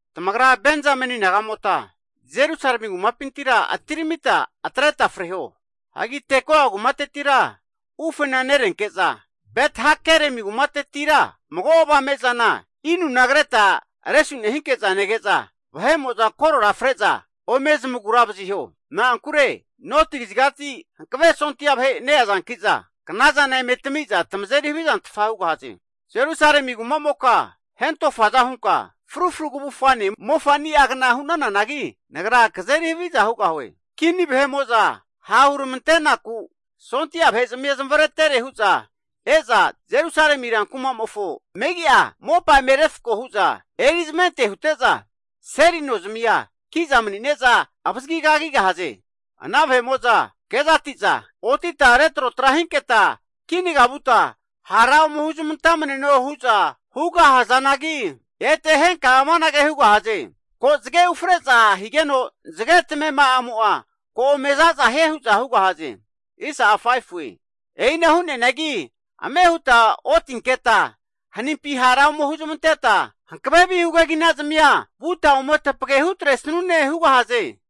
Tamagra Benzameni nagamota Jerusalemi kumapintira atiramita atreta freho. Hagi Tekoa kumatetira ufena nerenke'za, Bet-hakeremi kumatetira mago avame zana inuna kreta resu nehinke'za nege'za vahe'mo'za korora fre'za ome zamagura vaziho. Na'ankure noti kazigati hankave sondia vahe neazanki'za knazana eme tamiza tamazeri havizantfa hugahaze. Jerusalemi kumamoka hentofaza hunka frufru kavufgane mofani'agna hu'nananagi Nagra kazeri haviza hugahue. Kini vahe'mo'za ha' huramante'naku sondia vahezamia zamavaretere hu'za e'za Jerusalemi rankumamofo megi'a mopa eme refko huza eri zmante hute'za seli nozmia kiza manine'za avazigi kagigahaze. Ana vahe'mo'za kezati'za, otita retrotra hinketa kinaga vuta hara ome huzmantamneno hu'za huga hazanagi, ete henka amanage hugahaze, ko zage ufre'za higeno zage tamema'amo'a ko ome zaza hie hu'za hugahaze. E'ina hu'neanagi ame huta otinketa hanimpi hara ome huzmanteta, hankave vihu keginazamia vuta ome tapage hutresanune hugahaze.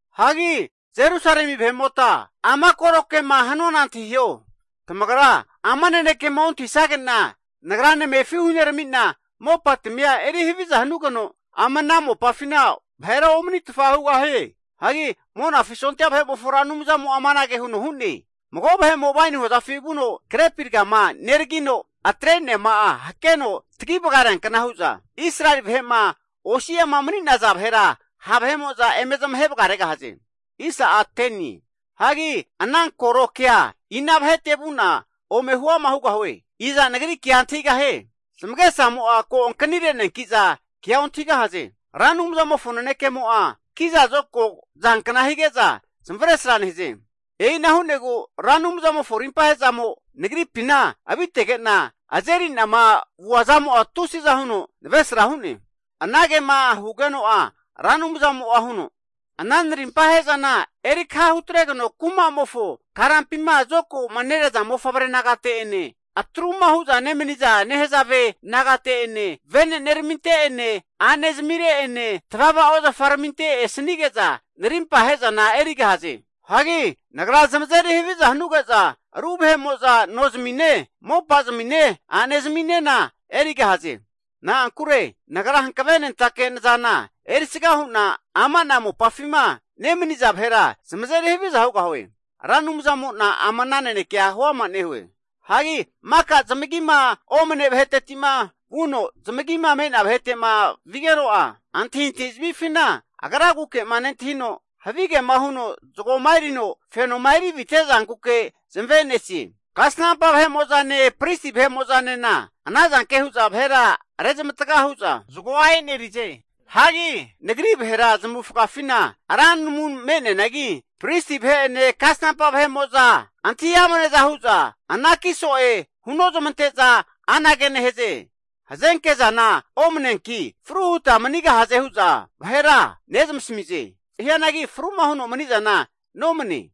Hagi Jerusalemi vahe'mota ama koro kema hanuana antahiho. Tamagra ama nanekema ontahisage'na, Nagra namefi hunerami'na mopatamia eri haviza hanugeno, ama ana mopafina vahera omanitfa hugahie. Hagi Monafi sondia vahe'mofo Ra Anumzamo'a amanage huno hu'ne. Mago vahe'mo waini hozafi vuno grepi ragama neragino atre'neama'a hakeno tagi vagareankna hu'za, Israeli vahe'ma osi'ama mani'naza vahera ha' vahe'mo'za eme zamahe vagaregahaze. Hagi ana koro kea ina vahete vu'na ome huama hugahue. Iza nagri kea antahigahie? Zamagesamo'a ko ankani re'neanki'za kea ontahigahaze. Ra Anumzamofo nanekemo'a kiza zokago zankna hige'za zamavesra nehaze. E'ina hu'negu Ra Anumzamofo rimpa ahezamo nagripina avitege'na azeri'nama vuazamo'a tusiza huno navesra hu'ne. Anagema hugeno'a Ra Anumzamo'a huno, ana narimpa ahe'zana eri kaha hutregeno kumamofo karampima zokago'ma neraza mofavre nagate'ene, atruma hu'za nemaniza nahezave nagate'ene, veneneraminte'ene a'ne zamire'ene, tavava ozafaraminte esanige'za narimpa ahe'zana erigahaze. Hagi Nagra zamazeri haviza hanuge'za ru vahe'mo'za nozamine mopazamine a'nezaminena erigahaze. Na'ankure Nagra hankavenentake nazana erisga hu'na ama'na mopafima nemaniza vahera zamazeri haviza hugahue. Ra Anumzamo'na ama ana nanekea huama nehue. Hagi maka zamagima omane vaheteti'ma vuno zamagima me'nea vahete'ma vigeno'a, antahintahi zamifina agraguke'ma nentahino havige'ma huno zagoma erino fenoma erivite zankuke zamave'nesie. Kasnampa vahe'mo'zane pristi vahe'mo'zanena anazanke hu'za vahera rezmataga hu'za zagoa e'nerize. Hagi Nagri vahera zamavufagafina ra namu me'neanagi pristi vahe'ene kasnampa vahe'mo'za antahi amneza hu'za ana namuna anaki so'e hunozamante'za anage nehaze, hazenkezana omne'neanki fru huta manigahaze hu'za vahera nezamasamize. Hianagi fruma huno manizana nomane.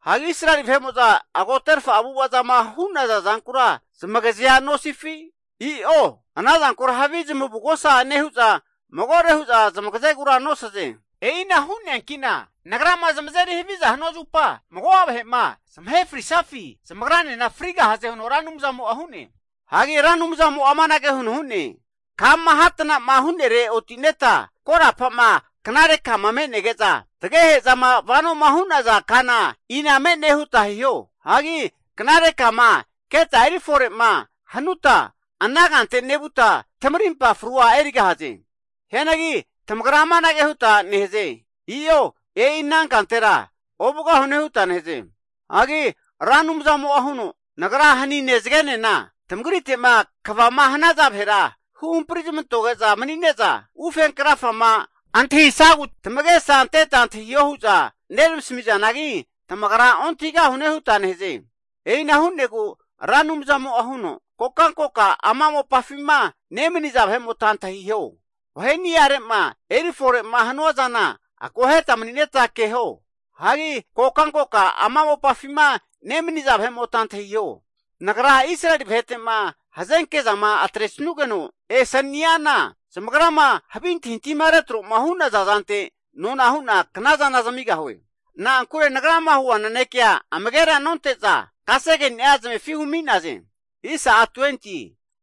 Hagi Israeli vahe'mo'za agoterfa avu'ava zama hu'naza zankura zamagazea nosifi? I'o ana zankura havi zamavugosa nehu'za magore hu'za zamagazegura nosaze. E'ina hu'neanki'na Nagrama zamazeri haviza hanua zupa mago'a vahe'ma zamahema frisufi zamagranena frigahaze huno Ra Anumzamo'a hu'ne. Hagi Ra Anumzamo'a amanage huno hu'ne. Kama hatna'ma hu'nere oti'neta korapa'ma knare kama me'nege'za tagehe'zama vanoma hu'naza kana ina me'ne huta hiho. Hagi knare kama keta eri fore'ma hanuta ana kante nevuta tamarimpa frua erigahaze. Hianagi tamagra amanage huta nehaze, I'o e'i ana kantera ovugahune huta nehaze. Hagi Ra Anumzamo'a huno, Nagra hanine zagenena tamagrite'ma kvama hanaza vahera huhampari zamantoge'za mani'neza, ufe krafama antahisagu tamagesa anteta antahiho hu'za neramasami zanagi tamagra ontahigahune huta nehaze. E'ina hu'negu Ra Anumzamo'a huno, kokankokama ama mopafima nemaniza vahe'mota antahiho. Vaheniare'ma eri fore'ma hanua zana akoheta mani'neta keho. Hagi kokankokama ama mopafima nemaniza vahe'mota antahiho. Nagra Israeli vahete'ma hazenke zama atresanugeno esaniana, zamagrama havi antahintahima retro'ma hu'naza zante nona hu'na knazana zamigahue. Na'ankure Nagrama hua nanekea amagera nonte'za, kasegeni'a zamefi humi'naze.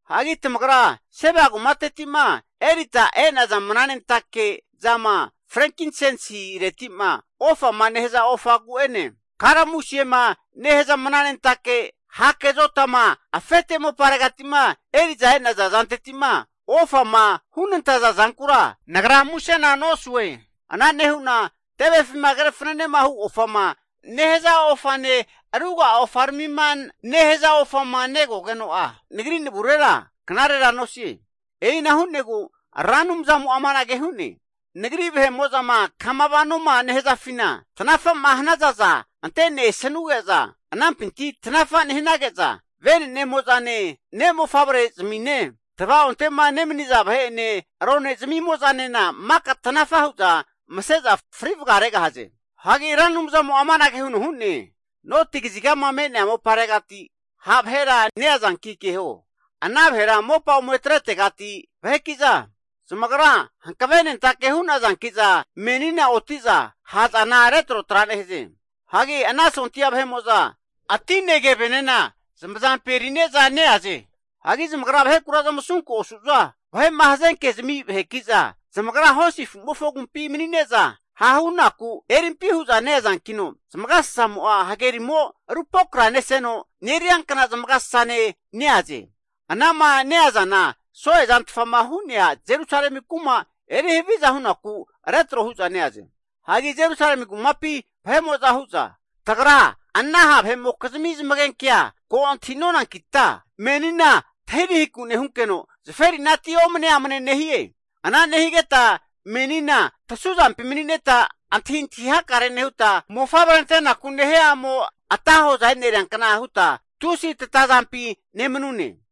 Hagi Tamagra Seba kumateti'ma erita e'naza mananentake zama frenkinsensi reti'ma ofama nehaza ofagu'ene, Kalamusiema nehaza mananentake hake zotama, afete moparegati'ma eri'za e'naza zanteti'ma ofama hunantaza zankura Nagra musena nosue. Ana nehu'na tevefima kre fananehu ofama nehaza ofane ruga'a ofaramima nehaza ofama negogeno'a, Nagri navurera knarera nosie. E'ina hu'negu Ra Anumzamo'a amanage hu'ne. Nagri vahe'mo'zama kama vanoma nehazafina tanafa'ma hanazaza ante'nesanuge'za anampinti tanafa nehanage'za, venenemoza'ne ne' mofavrezamine, tvaonte'ma nemaniza vahe'ene rone zamimo'zanena maka tanafa hu'za mase'za frivaga regahaze. Hagi Ra Anumzamo'a amanage huno hu'ne. Noti kazigama me'nea moparegati ha' vahera neazanki keho. Ana vahera mopa ome atretegati vaheki'za, zamagra hankavenentake hu'nazanki'za menina oti'za ha'zana retrotra nehaze. Hagi ana sondia vahe'mo'za atine kevenena zamazampi eri'neza neaze. Hagi zamagra vahekura zamasunku osu'za vahe'ma hazenkezmi vahekiza zamagra hosi afu'mofo agumpi mani'neza hahunaku erimpi hu'za neazankino, zamagasasamo'a hagerimo rupokraneseno neriankna zamagasasane neaze. Anama neazana so'e zantfama hu'nea Jerusalemi kuma eri haviza hunaku retro hu'za neaze. Hagi Jerusalemi kumapi vahe'mo'za hu'za, tagra ana ha' vahe'mokizmi zamagenkea ko antahi nonankita, menina tahirahiku nehunkeno zaferinati omne amne nehie. Ana nehigeta menina tasu zampi mani'neta antahintahi hakare nehuta, mofavre antenaku nehia a'mo ata hoza e'neriankna huta tusi tatazampi nemanune.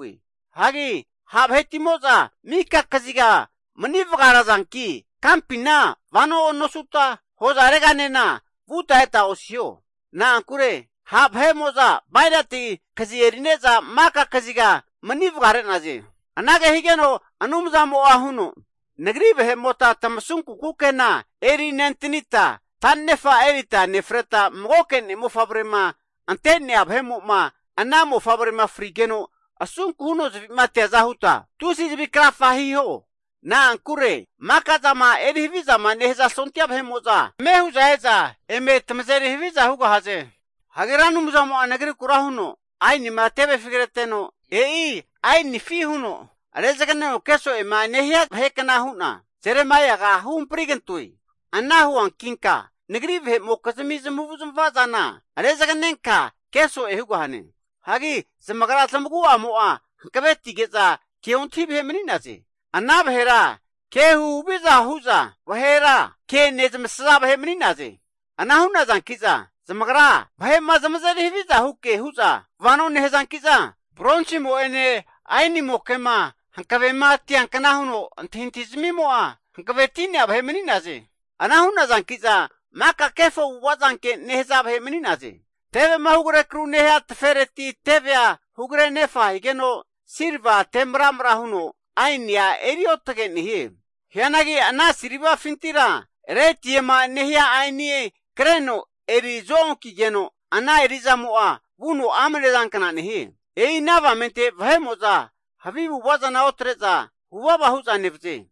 Hagi ha' vahetimo'za mika kaziga manivaga razanki kampina vano nosuta, hozareganena vuta eta osiho. Na'ankure ha' vahe'mo'za bainati kazi eri'neza mika kaziga mani vagare'naze. Anage higeno Anumzamo'a huno, Nagri vahemota tamasunku kukena erinentanita, ta'nefa erita nefreta magoke ne'mofavrema ante'nea vahemo'ma ana mofavrema frigeno asunku huno zavi'ma ateaza huta tusi zavi krafa hiho. Na'ankure maka zama eri havizama nehaza sondia vahe'mo'za ame hu'za e'za eme tamazeri haviza hugahaze. Hagi Ra Anumzamo'a nagrikura huno, ainima tevefi kreteno e'i ainifi huno rezaganeno keso'ema nehia vahekna hu'na, Jeremaiaga huhampri kantoe. Ana huankinka Nagri vahe'mokizmi zamavu'zmava zana rezaganenka keso'e hugahane. Hagi zamagra zamagu'amo'a hankavetige'za keontahi vahe mani'naze. Ana vahera ke huhaviza hu'za vahera ke nezamasaza vahe mani'naze. Ana hu'nazanki'za zamagra vahe'ma zamazeri haviza huke hu'za vano nehazanki'za bronsimo'ene ainimoke'ma hankavema tiankna huno antahintahizmimo'a hankaveti'nea vahe mani'naze. Ana hu'nazanki'za maka kefo avu'avazanke nehaza vahe mani'naze. Tevema hugre akru'ma nehia tefereti tevea hugre anefa higeno silva te maramra huno aenia eri otege nehie. Hianagi ana silvafintira retiema nehia ainia kreno eri zo-onkigeno ana eri'zamo'a vuno amne zankna nehie. E'ina avamente vahe'mo'za havi avu'ava zana otre'za huvava hu'za nevaze.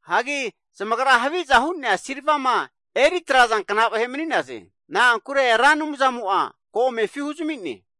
Hagi zamagra haviza hu'nea silvama eri trazankna vahe mani'naze. Na'ankure Ra Anumzamo'a ko amefi huzami'ne.